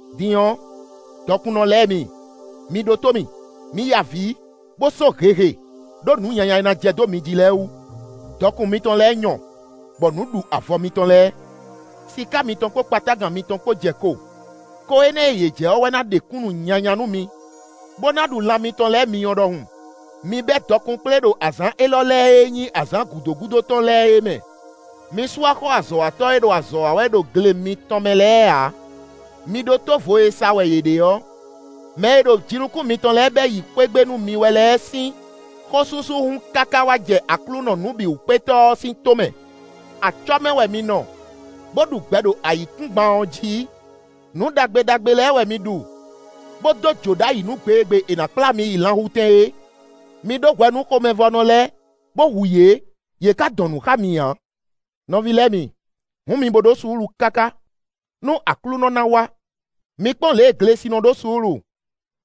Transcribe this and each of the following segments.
Din ɔ́, dɔkunnɔ lɛ́ɛ mi, mi ɖótó mì! Mi ya avǐ, bó só hehe, ɖó nǔ nyanya e ná jɛ dó mi jí lɛ́ɛ wú! Dɔkun mitɔn lɛ́ɛ nyɔ, bɔ nǔ ɖu avɔ mitɔn lɛ́ɛ. Siká mitɔn kpó kpatágan mitɔn kpó jɛ ko; ko énɛ́ e yě jɛ ɔ́ wɛ ná ɖe kúnnu nyanya nú mi bó ná ɖu lan mitɔn lɛ́ɛ myɔ ɖɔhun. Mi bɛ́ dɔkun kplé ɖo azǎn élɔ́ lɛ́ɛ e nyí azǎn gǔdo gúdo tɔn lɛ́ɛ é mɛ. Mi sú axɔ́ azɔ̌watɔ́ e ɖo azɔ̌ wa wɛ ɖo gle mitɔn mɛ lɛ́ɛ ǎ. Mi ɖótó vo e sa wɛ yě ɖe ɔ́! Mɛ e ɖo jinukún mitɔn lɛ́ɛ bɛ́ yi xwé gbe nú mi wɛ lɛ́ɛ sín xósúsú hun káká wá jɛ Aklúnɔ Nǔbǐwúkpétɔ́ ɔ́ sín tómɛ. Acɔ́ mɛ wɛ mi nɔ, bó ɖu gbɛ ɖo ayǐkúngban ɔ́ jí; nǔ ɖagbe ɖagbe lɛ́ɛ wɛ mi ɖu, bó dó jǒ ɖ'ayǐ nú gbe e gbe è nǎ kplá mi yi lanhutɛn é. Mi ɖó hwɛ nú xomɛvɔ́nɔ lɛ́ɛ, bó hu yě; yě ka dɔn nǔ xá mi ǎ. Nɔví lɛ́ɛ mi, hǔn mi bo ɖó suúlu káká, nú Aklúnɔ ná wá. Mi kpɔ́n lě e glesi nɔ ɖó suúlu,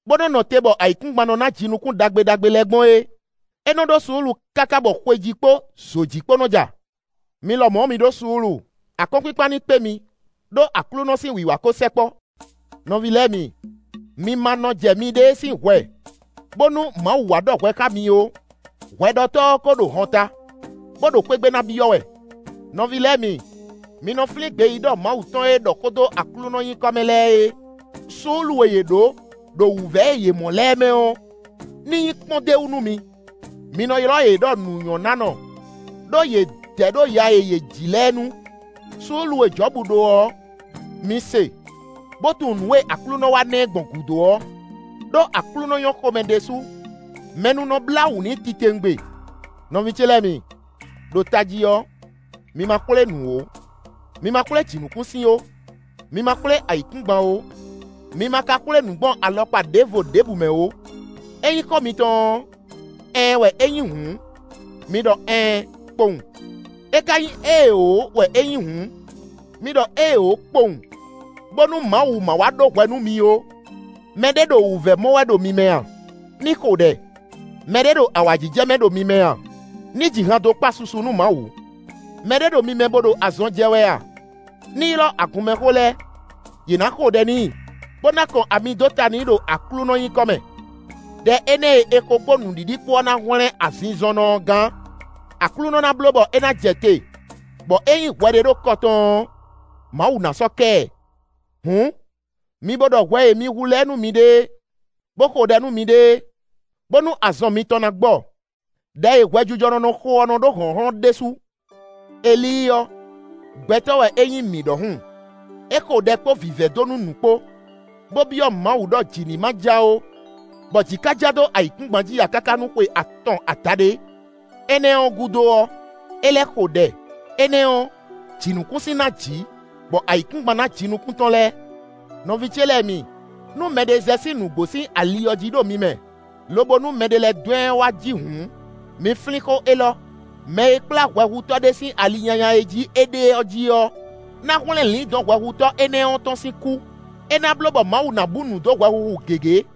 bó nɔ nɔ te bɔ ayǐkúngban nɔ ná jinukún ɖagbe ɖagbe lɛ́ɛ gbɔn é; é nɔ ɖó suúlu káká bɔ xwejí kpó zǒjí kpó nɔ ja. Mi lɔmɔ̌ ɔ́, mi ɖó suúlu; akɔ́nkpinkpan ní kpé mi, ɖó Aklúnɔ sín wiwa ko sɛkpɔ́. Nɔví lɛ́ɛ mi, mi ma nɔ jɛ miɖée sín hwɛ, bónú Mawu wá ɖɔ hwɛ xá mi ó. Hwɛɖɔtɔ́ ɔ́ ko ɖo hɔnta, bó ɖo xwé gbe ná byɔ́ wɛ. Nɔví lɛ́ɛ mi, mi nɔ flín gbeyíɖɔ Mawu tɔn e ɖɔ xó dó Aklúnɔ nyǐkɔ mɛ lɛ́ɛ é; suúlu e yě ɖǒ ɖo wǔvɛ́ e yě mɔ lɛ́ɛ mɛ ɔ́, ní nyí kpɔ́n d'é wú nú mi. Mǐ nɔ ylɔ́ yě ɖɔ nǔnyɔ́nánɔ, ɖó yě dɛ ɖo ya e yě ji lɛ́ɛ nu. Suúlu e Jɔ̌bu ɖó ɔ́, mi se, bó tunwun nǔ e Aklúnɔ wá ná ɛ gbɔn gúdo ɔ́; ɖó Aklúnɔ nyɔ́ xomɛ ɖésú; mɛ nú nɔ blá wǔ n'i titewungbe. Nɔví ce lɛ́ɛ mi, ɖo tají ɔ́, mi ma xwlé nǔ ó; mi ma xwlé jǐnukúnsin ó, mi ma xwlé ayǐkúngban ó, mi ma ka xwlé nǔ gbɔn alɔkpa ɖěvo ɖěbǔ mɛ ó. Ényí xó mitɔn ɔ́, ɛɛn wɛ é nyí hǔn, mi ɖɔ “ɛɛn” kpowun; é ka nyí éeǒ wɛ é nyí hǔn, mi ɖɔ “éeǒ” kpowun, bónú Mawu ma wá ɖó hwɛ nú mi ó. Mɛ ɖé ɖo wǔvɛ́ mɔ wɛ ɖo mi mɛ a? Ní xo ɖɛ. Mɛ ɖé ɖo awǎjijɛ mɛ ɖo mi mɛ a? Ní ji han dó kpa susu nú Mawu. Mɛ ɖé ɖo mi mɛ bó ɖo azɔn jɛ wɛ a? Ní ylɔ́ agunmɛxó lɛ́ɛ; yě ná xo ɖɛ n'i, bó ná kɔn ami dó ta n'i ɖo Aklúnɔ nyǐkɔ mɛ. Đɛ énɛ́ e è xo kpó nǔɖiɖi kpó ɔ́ ná hwlɛ́n azinzɔnnɔ ɔ́ gán. Aklúnɔ ná bló bɔ é ná jɛ te, bɔ ényí hwɛ ɖé ɖo kɔ tɔn ɔ́, Mawu ná sɔ́ kɛ ɛ. Hǔn, mi bo ɖɔ hwɛ e mi hu lɛ́ɛ nú miɖée, bó xo ɖɛ nú miɖée, bónú azɔn mitɔn ná gbɔ. Đɛ e hwɛjijɔnɔ nɔ xo ɔ́ nɔ ɖó hlɔ̌nhlɔ́n ɖésú. Elíi ɔ́, gbɛtɔ́ wɛ é nyí mǐ ɖɔhun: é xo ɖɛ kpó vǐvɛ́ dó nú nǔ kpó, bó byɔ́ Mawu ɖɔ jǐ ní ma ja ó, bɔ jǐ ka ja dó ayǐkúngban jí ǎ káká nú xwe atɔn adaɖé. Énɛ́ ɔ́ gúdo ɔ́, é lɛ́ xo ɖɛ; énɛ́ ɔ́, jǐnukúnsin ná jǐ, bɔ ayǐkúngban ná jinukún tɔn lɛ́ɛ. Nɔví ce lɛ́ɛ mi, nú mɛɖé zɛ sín nǔgbó sín ali ɔ́ jí ɖo mi mɛ, lobo nú mɛɖé lɛ́ dɔn ɛ wá jí hǔn, mi flín xó élɔ́: mɛ e kplá hwɛhutɔ́ ɖé sín ali nyanya e jí é ɖe ɔ́ jí ɔ́, ná hwlɛ́n lǐndɔ̌n hwɛhutɔ́ énɛ́ ɔ́ tɔn sín kú. É ná bló bɔ Mawu ná bú nǔ dó hwɛhuhu gěgé.